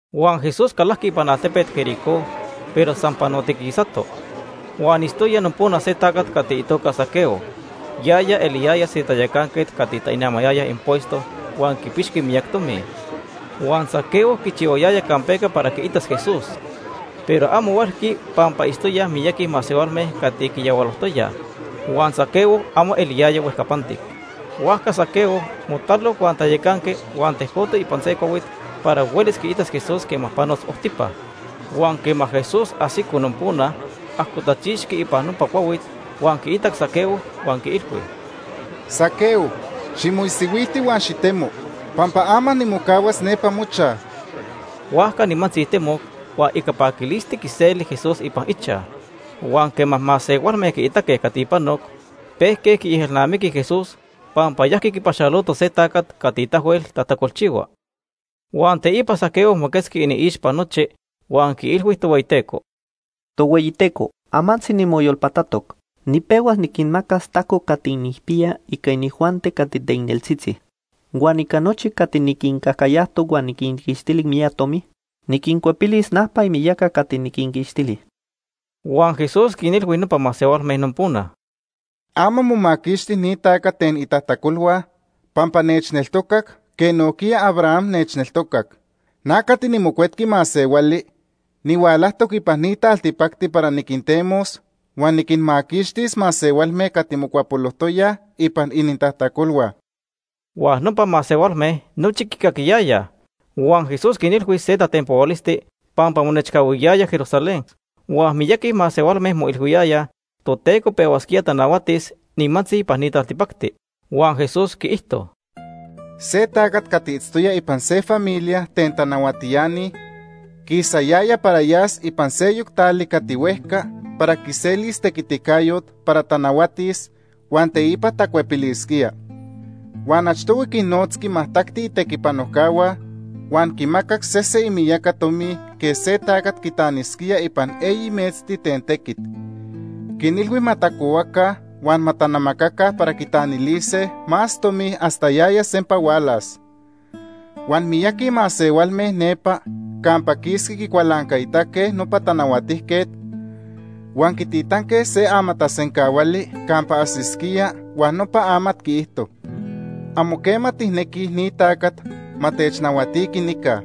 Huan Jesús calajqui ipan altepet Jericó, pero san panotiquisato. Huan itztoya nopona se tacat cati itoca Zaqueo. Yaya eliyaya se tayacanquet cati tainamayaya impuesto huan quipixqui miyac tomi. Huan Zaqueo quichihuayaya campeca para quiitas Jesús, pero amo huelqui pampa itztoyaj miyaqui masehualme cati quiyahualojtoyaj, huan Zaqueo amo huejcapantic. Huajca Zaqueo motalo huan tayacanqui huan tejcoto ipan se cuahuit para huelis quiitas Jesús quema panos ojtipa. Huan quema Jesús ajsico nopona, ajcotachixqui ipan nopa cuahuit huan quiitac Zaqueo huan quiilhui: ―Zaqueo, ximoisihuilti huan xitemo, pampa ama nimocahuas nepa mochaj. Huajca nimantzi temoc, huan ica paquilisti quiseli Jesús ipan ichaj. Huan quema masehualme quiitaque cati panoc, pejque quiejelnamiquij Jesús pampa yajqui quipaxaloto se tacat cati tahuel tajtacolchihua. Huan teipa Zaqueo moquetzqui iniixpa nochi huan quiilhui Tohueyiteco: ―Tohueyiteco, amantzi nimoyolpatatoc. Nipehuas niquinmacas tajco cati nijpiya ica inijuanti cati teicneltzitzi. Huan ica nochi cati niquincajcayajtoc huan niquinquixtili miyac tomi, niquincuepilis najpa imiyaca cati niquinquixtili. Huan Jesús quinilhui nopa masehualme nopona: ―Ama momaquixti ni tacat ten itajtacolhua pampa nechneltocac quej nojquiya Abraham nechneltocac. Na cati niMocuetqui Masehuali nihualajtoc ipan ni taltipacti para niquintemos huan niquinmaquixtis masehualme cati mocuapolojtoyaj ipan inintajtacolhua. Huan nopa masehualme nochi quicaquiyayaj. Huan Jesús quinilhui se tatenpohualisti pampa monechcahuiyaya Jerusalén, huan miyaqui masehualme moilhuiyayaj Toteco pehuasquía tanahuatis nimantzi ipan ni taltipacti. Huan Jesús quiijto: “Se tacat cati itztoya ipan se familia ten tanahuatiani quisayaya para yas ipan seyoc tali cati huejca para quiselis tequiticayot para tanahuatis, huan teipa tacuepilisquía. Huan achtohui quinnotzqui majtacti itequipanojcahua huan quinmacac sese imiyaca tomi quej se tacat quitanisquía ipan eyi metzti ten tequit. Quinilhui ma tacohuaca huan ma tanamacaca para quitanilise más tomi hasta yaya sempa hualas. Huan miyaqui masehualme nepa campa quisqui quicualancaitaque nopa tanahuatijquet huan quititanque se amatasencahuali campa ajsisquía huan nopa amat quiijto: ‘Amo quema tijnequij ni tacat ma technahuatiqui nica.’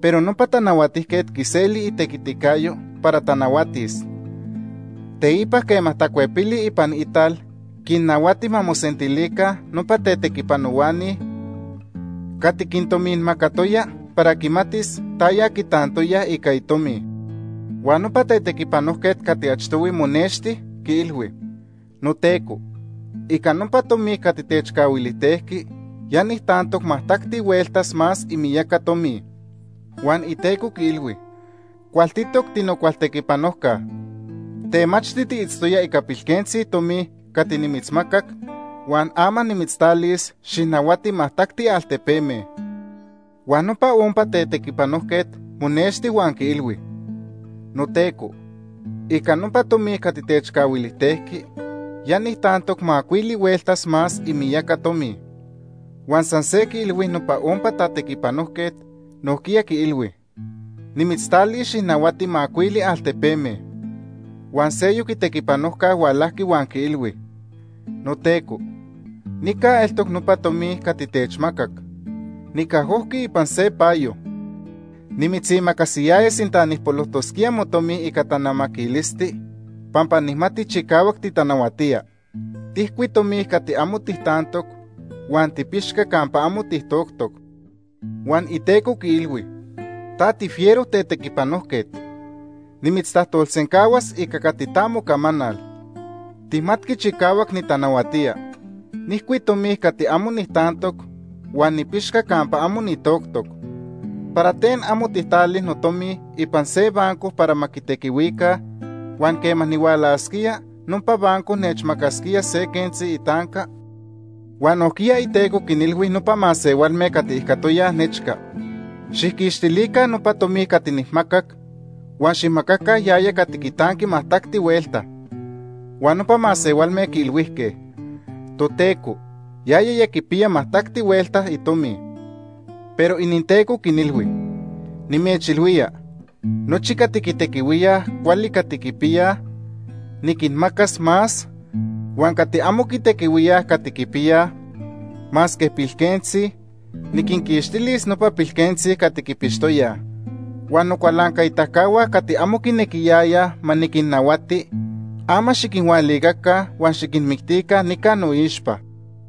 “Pero nopa tanahuatijquet quiseli itequiticayo para tanahuatis. Teipa quema tacuepili ipan ital quinnahuati ma mosentilica nopa tetequipanohuani cati quintominmacatoya para quimatis taya quitantoyaj ica itomi. Huan nopa tetequipanojquet cati achtohui monexti, quiilhui: ‘Noteco, ica nopa tomi cati techcahuilijtejqui ya nijtantoc majtacti huelta más imiyaca tomi.’ Huan iteco quiilhui: ‘Cualtitoc, tinocualtequipanojca. Temachti tiitztoya ica pilquentzi tomi cati nimitzmacac, huan ama nimitztalis xijnahuati majtacti altepeme.’ Huan nopa ompa tetequipanojquet monexti huan quiilhui: ‘Noteco, ica nopa tomi cati techcahuilijtejqui, ya nijtantoc macuili hueltas más imiyaca tomi.’ Huan san se quiilhui nopa ompa tetequipanojquet, nojquiya quiilhui: ‘Nimitztalis xijnahuati macuili altepeme.’ “Huan seyoc itequipanojca hualajqui huan quiilhui: ‘Noteco, nica eltoc nopa tomi cati techmacac. Nicajojqui ipan se payo. Nimitzimacasiyaya sinta nijpolojtosquía motomi ica tanamaquilisti, pampa nijmati chicahuac titanahuatía. Tijcui tomi cati amo tijtantoc huan tipixca campa amo titoctoc.’ Huan iteco quiilhui: ‘Ta tifiero tetequipanojquet, nimitztajtolsencahuas ica cati ta mocamanal. Tijmatqui chicahuac nitanahuatía. Nijcui tomi cati amo nijtantoc huan nipixca campa amo nitoctoc. ¿Para ten amo tijtali notomi ipan se banco para ma quitequihuicaj, huan quema nihualasquía, nopa banco nechmacasquía se quentzi itanca?’ “Huan nojquiya iteco quinilhui nopa masehualme cati ijcatoyaj nechca: ‘Xijquixtilica nopa tomi cati nijmacac, huan xijmacaca yaya cati quitanqui majtacti huelta.’ Huan nopa masehualme quiilhuijque: ‘Toteco, yaya ya quipiya majtacti huelta itomi.’ “Pero ininteco quinilhui: ‘Nimechilhuía, nochi cati quitequihuíaj cuali cati quipiyaj, niquinmacas más, huan cati amo quitequihuíaj cati quipiyaj, masque pilquentzi, niquinquixtilis nopa pilquentzi cati quipixtoyaj. Huan nocualancaitacahua cati amo quinequiyayaj ma niquinnahuatiqui, ama xiquinhualicaca huan xiquinmictica nica noixpa.’”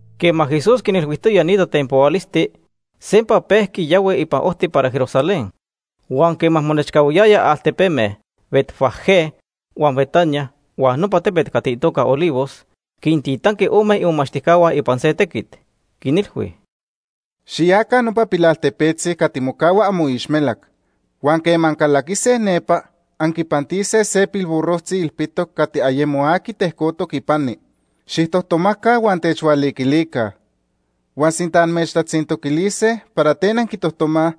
Quema Jesús quinilhuijtoya ni tatenpohualisti, sempa pejqui yahui ipan ojti para Jerusalén. Huan quema monechcahuiyaya altepeme Betfagé huan Betania huan nopa tepet cati itoca Olivos, quintitanqui ome imomachtijcahua ipan se tequit, quinilhui: ―Xiyaca nopa pilaltepetzi cati mocahua amoixmelac huan quema ancalaquise nepa anquipantise se pilburrojtzi ilpitoc cati ayemo aqui tejcotoc ipani. Xijtojtomaca huan techhualiquilica. Huan sinta amechtatzintoquilise para ten anquitojtomaj,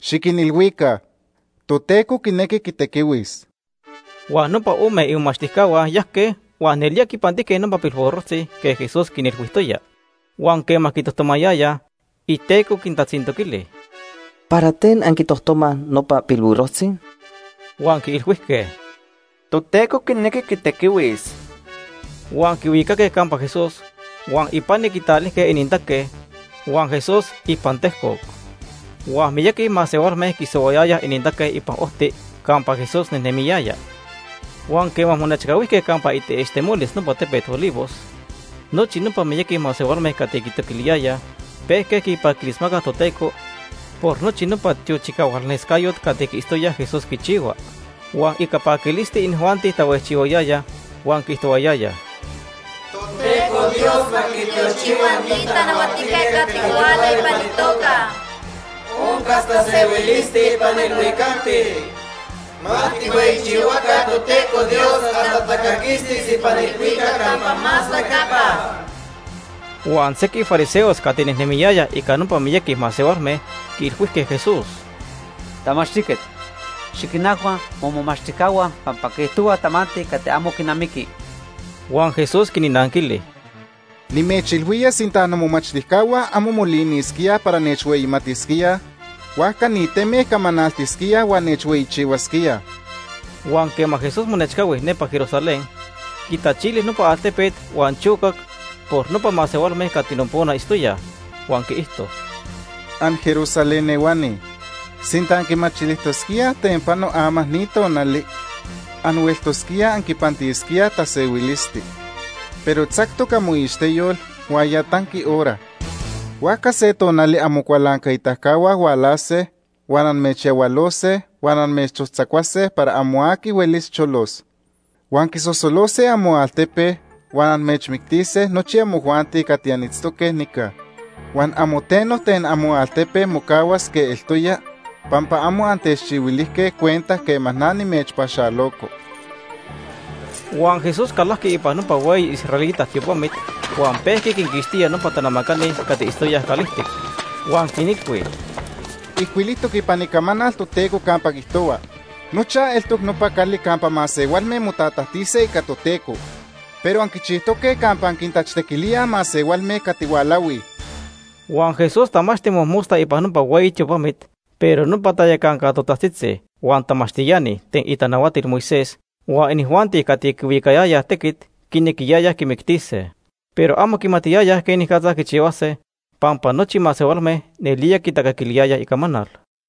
xiquinilhuica: ‘Toteco quinequi quitequihuis.’ Huan nopa ome imomachtijcahua yajque huan nelía quipantijque nopa pilburrojtzi quej Jesús quinilhuijtoya. Huan quema quitojtomayayaj, iteco quintatzintoquili: ―¿Para ten anquitojtomaj nopa pilburrojtzi? Huan quiilhuijque: ―Toteco quinequi quitequihuis. Huan quihuicaque campa Jesús, huan ipani quitalilijque inintaque, huan Jesús ipan tejcoc. Huan miyaqui masehualme quisohuayayaj inintaque ipan ojti campa Jesús nejnemiyaya. Huan quema monechcahuijque campa itaixtemolis nopa tepet Olivos, nochi nopa miyaqui masehualme cati quitoquiliyayaj pejque quipaquilismacaj Toteco por nochi nopa tiochicahualnescayot cati quiitztoyaj Jesús quichihua. Huan ica paquilisti, inijuanti tahuejchihuayayaj huan quiijtohuayayaj: “¡Toteco Dios ma quitiochihua ni tanahuatijquet cati huala ipan itoca Ica itequiticayo.! Oncas tasehuilisti ipan ilhuicacti. ¡Ma tijhueyichihuaca Toteco Dios hasta tacaquistis ipan ilhuicac campa más huejcapa!” Huan sequij fariseos cati nejnemiyayaj ica nopa miyaqui masehualme quiilhuijque Jesús: ―Tamachtijquet, xiquinajhua momomachtijcahua pampa quiijtohuaj tamanti cati amo quinamiqui. Huan Jesús quinnanquili: ―Nimechilhuía sinta nomomachtijcahua amo molinisquíaj para nechhueyitalisquíaj, huajca ni teme camanaltisquíaj huan nechhueyichihuasquíaj. Huan quema Jesús monechcahui nepa Jerusalén, quitachili nopa altepet huan chocac por nopa masehualme cati nopona itztoyaj, huan quiijto: “AnJerusalén ehuani, sinta anquimachilijtosquíaj ten pano ama ni tonali, anhueltosquíaj anquipantisquíaj tasehuilisti. Pero tzactoc amoixteyol huan ya tanqui hora. Huajca se tonali amocualancaitacahua hualase huan amechyahualose huan amechojtzacuase para amo aqui huelis cholos. Huan quisosolose amoaltepe huan amechmictise nochi amojuanti cati anitztoque nica. Huan amo teno ten amoaltepe mocahuas quej eltoya, pampa amo antechchihuilijque cuenta quema na nimechpaxaloco.” Huan Jesús calajqui ipan nopa hueyi israelita tiopamit huan pejqui quinquixtía nopa tanamacani cati itztoyaj calijtic. Huan quinilhui: ―Ijcuilijtoc ipan Icamanal Toteco campa quiijtohua: ‘Nochaj eltoc nopa cali campa masehualme motatajtise ica Toteco.’ Pero anquichijtoque campa anquintachtequilíaj masehualme cati hualahuij. Huan Jesús tamachti mojmosta ipan nopa hueyi tiopamit, pero nopa tayacanca totajtzitzi, huan tamachtiani ten itanahuatil Moisés, huan inijuanti cati quihuicayayaj tequit quinequiyayaj quimictise. Pero amo quimatiyayaj quenicatza quichihuase pampa nochi masehualme nelía quitacaquiliyayaj icamanal.